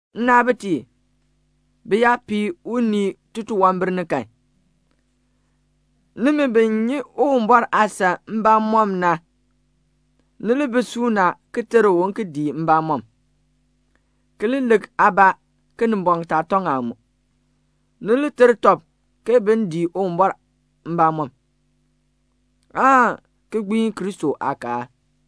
Nnaabitiib, bi yaa pii unii titunwambir ni kan, nimi bi nyi Uwumbɔr aasan mbamɔm na, ni li bi suuna ki ter u un ki dii mbamɔm, ki li lik aabaa, Kinimbɔŋ taa tɔŋ aa mu. Ni li ter tɔb ke bin dii Uwumbɔr mbamɔm, aan ki gbiin Kristo aakaal.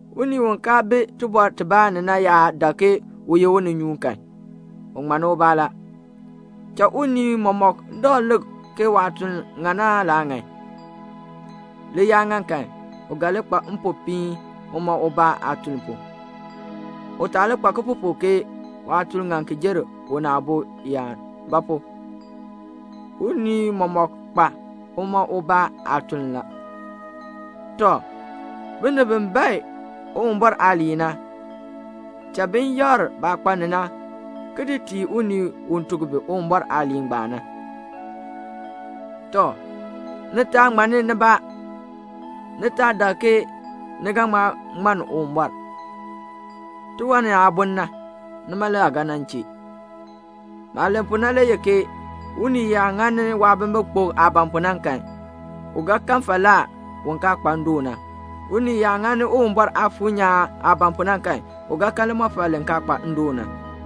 Unii u kaa bi tibɔr tibaa ni na yaa dak ke u ye uninyuun kan, u ŋmanni ubaa la. Cha unii mɔmɔk dakl lik waatuln ŋan aan laa ŋan. Li yaa ŋan kan, u ga li kpa mpopiin uma ubaa aatuln pu. U taa nyu baalaa ke waatuln ŋan ki jer una aabo yaan. Ba pu? unii mɔmɔk kpa uma ubaa aatuln la. Tɔ, binib bi bae Uwumbɔr aaliin na, cha bin yakr baah kpa ni na ki di tii unii u tuk bi Uwumbɔr aaliin na. Tɔ, ni taa ŋmanni nibaa; ni taa dak ke ni ga ŋma ŋmann Uwumbɔr; tiwan ni aa bun na, nima le aa ga nan chee. Maah len pu na le ye ke unii yaa ŋani waabimbikpok aah ban pu na kan, u ga kan falaa u kaa kpa ndoon na. Unii yaa ŋani Uwumbɔr Aafuur nyaan aah ban pu na kan, u ga kan limɔfal li kaa kpa ndoon na.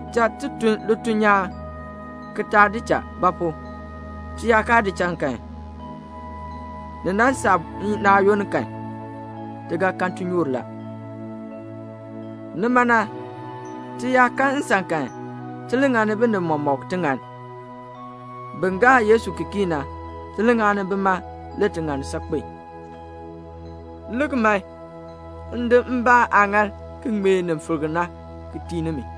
Cha ti tun lituln nyaan ki taa di cha; ba pu? ti yaa kaa di cha kan, ni nan saa naayoonn kan, ti ga kan tinyoor la. Nima na, ti yaa kan nsan kan, ti li ŋani binib mɔmɔk tiŋann. Bin gaa Yesu ki kii na, ti li ŋani bima le tiŋann saakpen. Lik, m di min mbaa aaŋaal, ki ŋmee nin filk na tii nimi.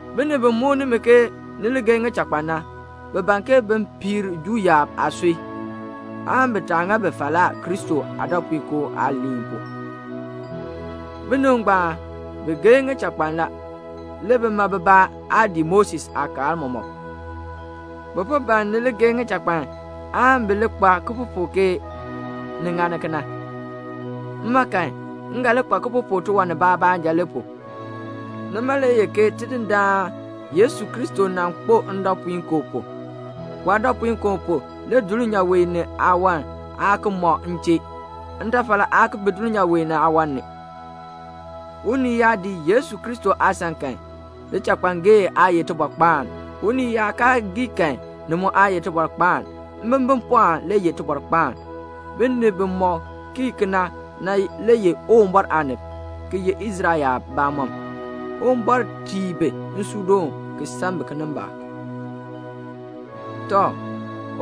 Binib bi muk nimi ke ni li geei ŋichakpan na, bi ban ke bin piir Juu yaab aasui, aan bi taa ŋa bi falaa Kristo aadɔpuinkoo aaliin pu. Binib ngbaan, bi geei ŋichakpan la; le bima bibaa aa dii Moses aakaal mɔmɔk. Bi po ban ni li geei ŋichakpan, aan bi li nyu baalaa ke ni ŋa kena. Mma kan, m ga nyu baalaa tiwan nibaa baanja le pu, ke Tidindaan Yesu Kristo nan kpo ndɔpuinkoo pu. Waadɔpuinkoo pu, dulnyaa wee ni aawan aa ki mɔ m chee. Ntafal aa ki bi dulnyaa wee ni aawan ni. Unii yaa dii Yesu Kristo aasan kan, lichakpangee aa ye tibɔrkpaan, unii yaa kaa gii kan, ni mu aa ye tibɔrkpaan. Mbimbipɔɔn le ye tibɔrkpaan. Binib bimɔk kii kena na le ye Uwumbɔr aanib, ki ye Israel yaab bamɔnn. Uwumbɔr tii bi nsuudoon ki san bi kinimbaak. Tɔ,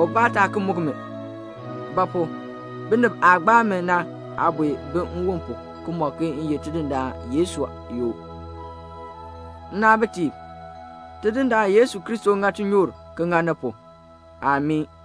ubaa taa ki muk mi; ba pu? binib aah gbaa mi na aabue bi nwon pu, ki mɔk ke m ye Tidindaan Yesu yoo. Nnaabitiib, Tidindaan Yesu Kristo ŋa tinyoor ŋa ni pu. Amii.